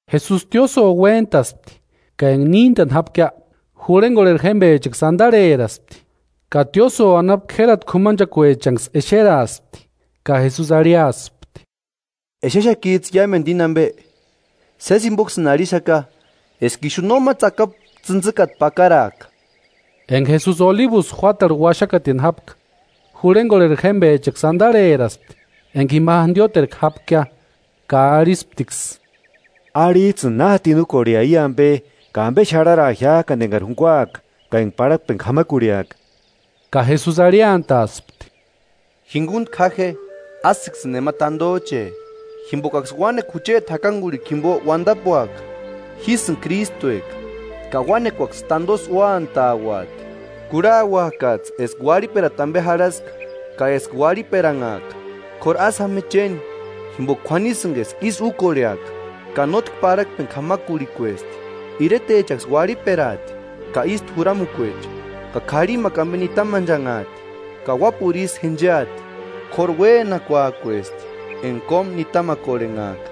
Jesusi tiósïo uéntaspti ka enka níntani jápkia, jurhenkorheri jémpechaksï antarheraspti, ka tiósïo anapu k'érati k'umanchekuechanksï exeraaspti. Ka Jesusi arhiaspti: “¿Exexakits'ï iámentu íni ampe? Sési jimpoksïni arhixaka eska ixu nóma tsakapu tsïntsïkata pakaraaka.” Enka Jesusi Olibusï juátarhu uaxakatini jápka, jurhenkorheri jémpechaksï antarheraspti enka ima jantioterku jápkia ka arhisptiksï: “Arhits'ïni, ¿Na jatini úkorhea i ampe, ka ampe xarharaa jiák'ani enkari junkuaka ka enka parhakpeni k'amakurhiaka?” Ka Jesusi arhiantaaspti: “Jinkuntku ja je, ásïksïni nema tantoch'e, jimpokaksï uánekua jucheti jakankurhikua jimpo uantapuaka: ‘Jísïni Krístueka’ ka uánekuaksï tantosï úantauati. Kurhauakats'ï eska uarhiperata ampe jarhaska ka eska uarhiperanhaaka, k'óru ásï jáma je chéni, jimpoka k'uanisïnka eska ísï úkorheaka, ka nótki parhakpeni k'amakurhikuesti. Iretechaksï uarhiperaati ka ístu juramukuecha, ka k'arhimakua ampe nitamanchanhaati ka uápuru isï jencheati. K'óru uénakuak'uesti enka kómu nitamakorhenhaaka.”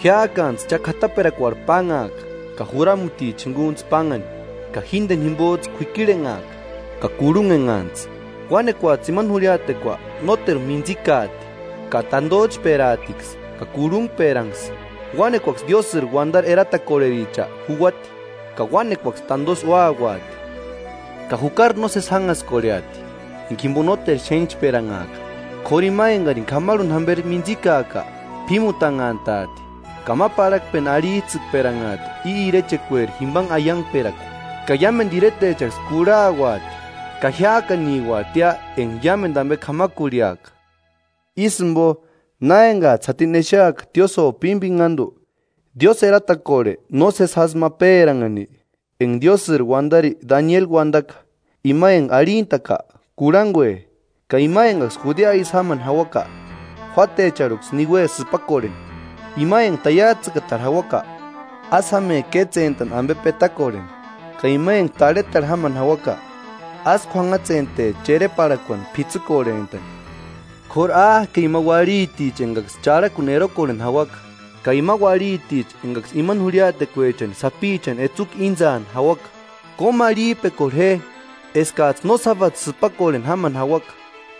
“Jiák'antsï cha k'ataperakuarhu pánhaaka ka juramuticha jinkuntsï pánhani, ka jínteni jimpots'ï kuikirhenhaaka ka kurhunhenhantsï. Uánekuats'ï imani jurhiatekua nóteru mintsikaati ka tantoch'peraatiksï ka kurhunhperanksï. Uánekuaksï diósïri uantari eratakorhericha juuati ka uánekuaksï tantosï úauati. Ka jukari nósesi jánhaskorheati enka jimpo nóteru xénhchperanhaaka. K'óru ima enkarini k'amarhuni jamperi mintsikaaka, p'ímutannhantaati. Ka ma parhakpeni arhits'ïkperanhaati i irechekueri jimpanhe aiankperakua, ka iámentu iretechaksï kurhauati ka jiák'aniuatia enka iámentu ampe k'amakurhiaka.” “Ísï jimpo, na enkats'ï jatini exeaka tiósïo pimpinhantu, diósï kua nósesi jásï ma péranhani, enka Diósïri uantari Danieli uantaka: ‘Ima enka arhintak'a, kurhankue,’ ka ima enkaksï Judea isï jámani jauaka, juátecharhuksï niue sïpakorheni. Ima enka taiats'ïtakatarhu jauaka, ásï jáme kétsentani ampe petakorheni. Ka ima enka tarhetarhu jámani jauaka, ásï k'uanhatsente chereparhakuani p'itsïkorhent'ani. K'óru ¡Áke ima uarhiticha enkaksï charhakuni erokorheni jauaka, ka ima uarhiticha enkaksï ima jurhiatekuechani sapichani etsukua íntsaani jauaka!” “Kómarhip'ekorhe je eskats'ï no sábadu sïpakorheni jámani jauaka,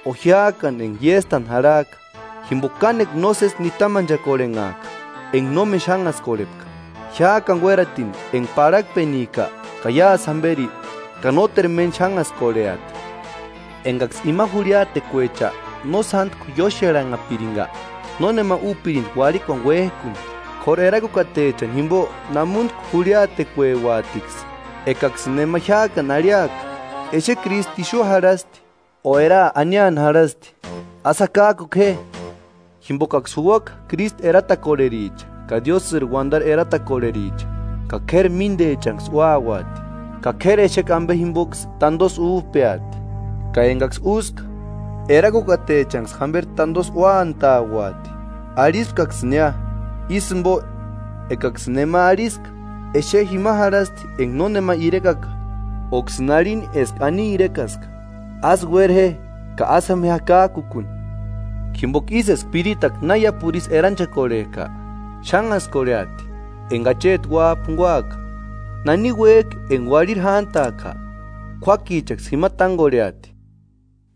o jiák'ani enka iéstani jarhak'a. Jimpoka kánekua nósesi nitamanchakorhenhaaka enka nómeni xánhaskorhepka jiák'ani uératini enka parhakpenika ka iásï jamperi, ka nóteru méni xánhaskorheati. Enkaksï ima jurhiatekuecha no sántku ióxeranhapirinka, nónema úpirinti uarhikuani uék'uni: K'óru erakukatechani jimpo námuntku jurhiatekueuatiksï.” “Ekaksïni nema jiák'ani arhiaka: Exe Krístu ixu jarhasti, o eraa aniani jarhasti, ásï jakak'uku je, jimpokaksï juuaka Krístu eratakorhericha ka diósïri uantari eratakorhericha, ka k'érati míntechanksï úauati, ka k'éri exekua ampe jimpoksï tantosï úp'eati, ka enkaksï úska, erakukatechanksï jamperi tantosï úantauati. Arhispkaksïnia: Ísï jimpo ekaksïni nema arhiska: ‘Exe jima jarhasti enka nónema irekaka,’ óksïni arhini eska ani irekaska, ásï uéra je ka ásï jáma je jakak'uni. Jimpoka ísï eska piritakua na iápuru isï eranchekorhek'a, xánhaskorheati enka Acheti Uáp'a junkuaka. Nani uék'i enka uarhiri jántak'a, k'uákichaksï jima tánkorheati.”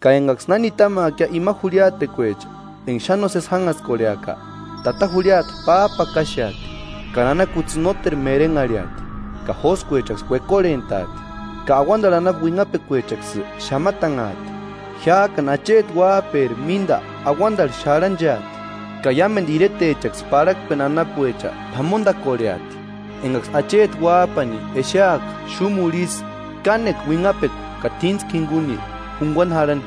“Ka enkaksï na nitamaakia ima jurhiatekuecha enka xáni nósesi jánhaskorheaka: ‘Tata jurhiata páp'akaxeati, ka nana kutsï nóteru merenharhiati, ka jóskuechaksï uekorhent'aati, ka auantarhu anapu uinhapekuechaksï xamatanhaati.’ Jiák'ani Acheti Uáp'eri mínta auantarhu xarhancheati, ka iámentu iretechaksï parhakpeni anapuecha p'amontakorheati, enkaksï Acheti uáp'ani exeaka xúmurhu ísï kánekua uinhapekua ka t'íntskua jinkuni junkuani jarhani.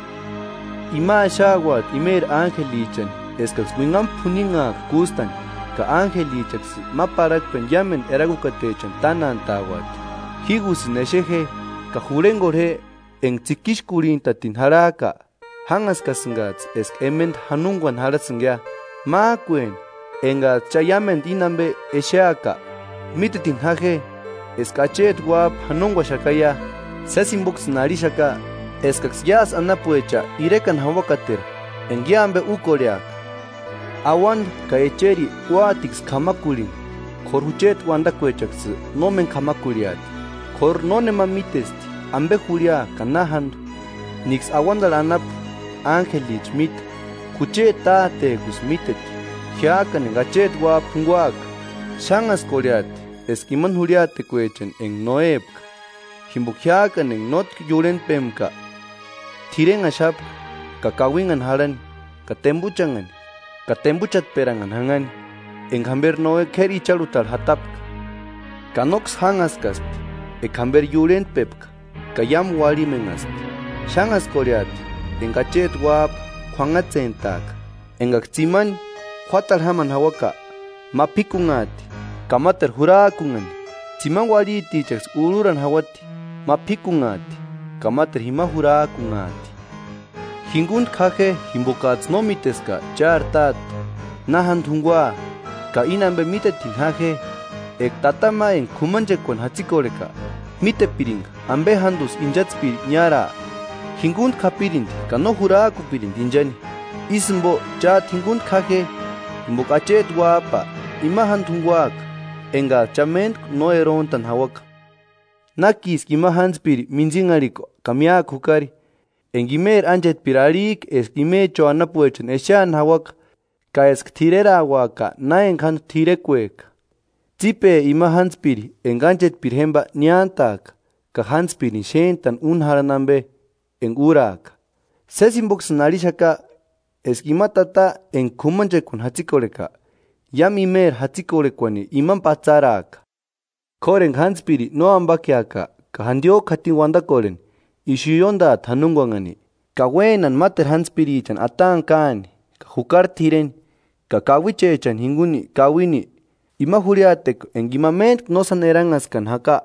Ima axauati imeri ánjelichani eskaksï uinhamu p'uninhaaka kústani, ka ánjelichaksï ma parhakpeni iámentu erakukatechani tánantauati.” “Jígusïni exe je ka jurhenkorhe je, enka tsikixkurhintatini jarhak'a, jánhaskasïnkats'ï eska ementa janonkuani jarhasïnkia. Mák'ueni, enkats'ï cha iámentu íni ampe exeaka, mítetini ja je eska Acheti Uáp'a janonkuaxakaia. Sési jimpoksïni arhixaka eskaksï iásï anapuecha irekani jauakateru enka i ampe úkorheaka. Auanta ka echeri úatiksï k'amakurhini, k'óru jucheti uantakuechaksï nómeni k'amakurhiati.” “K'óru nónema mítesti ampe jurhia ka na jántu, níksï auantarhu anapu ánjelicha míte, jucheti Tátek'usï míteti.” “Jiák'ani enka Acheti uáp'a junkuaka, xánhaskorhesti eska imani jurhiatekuechani enka Noépka. Jimpoka jiák'ani enka nótki iurhentpempka, t'irenhaxapka ka kauinhani jarhani ka tempuchanhani ka tempuchatperanhani janhani, enka jamperi Noe k'éri icharhutarhu jatapka. Ka nóksï jánhaskaspti eka jamperi iurhentpepka ka iámu uarhimenhaspti. Xánhaskorheati enka Acheti uáp'a k'uanhatsentaaka. Enkaksï tsimani juátarhu jámani jauaka: Ma p'íkunhaati ka máteru jurak'unhani. Tsimani uarhitichaksï urhuni jauati, ma p'íkunhaati ka máteru jima jurak'unhani.” “Jinkuntku ja je jimpokats'ï no míteska chári Táte na jántu junkuaa. Ka íni ampe mítetini ja je, eka tata ma enka k'umanchekuani jatsikorheka mítepirinka ampe jántusï inchantspiri niáraa, jinkuntku japirinti ka no jurak'upirinti inchani. Ísï jimpo chát'u Jinkuntku ja je, jimpoka Acheti Uáp'a ima jántu junkuaka enkats'ï cha méntku no eront'ani jauaka.” “¿Nákiski ima jántspiri mintsinharhikua ka míakua jukari, enka imeri ánchetpiri arhik'a eska imecho anapuechani exeani jauaka ka eska t'irerauaka na enka jántu t'irekuek'a? Tsípe ima jántspiri enka ánchetpiri jémpa niántaaka, ka jántspirini xéntani úni jarhani ampe enka úraka. Sési jimpoksïni arhixaka eska ima tata enka k'umanchekuani jatsikorheka, iámu imeri jatsikorhekuani imani patsaraaka. K'óru eka jántspiri no ampakeaka ka jantiok'u jatini uantakorheni, ixu ióntaati janonkuanhani, ka uénani máteru jántspirichani ataani káani ka jukari t'ireni ka kauichechani jinkuni kauini. Ima jurhiatekua enka ima méntku no sáni eranhaskani jaka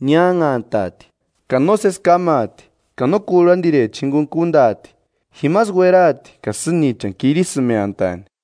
niánhantaati, ka nósesi kámaati, ka no kurhantirechani jinkuni kuntaati; jimasï ueraati ka sînichani kirisïmeantaani.”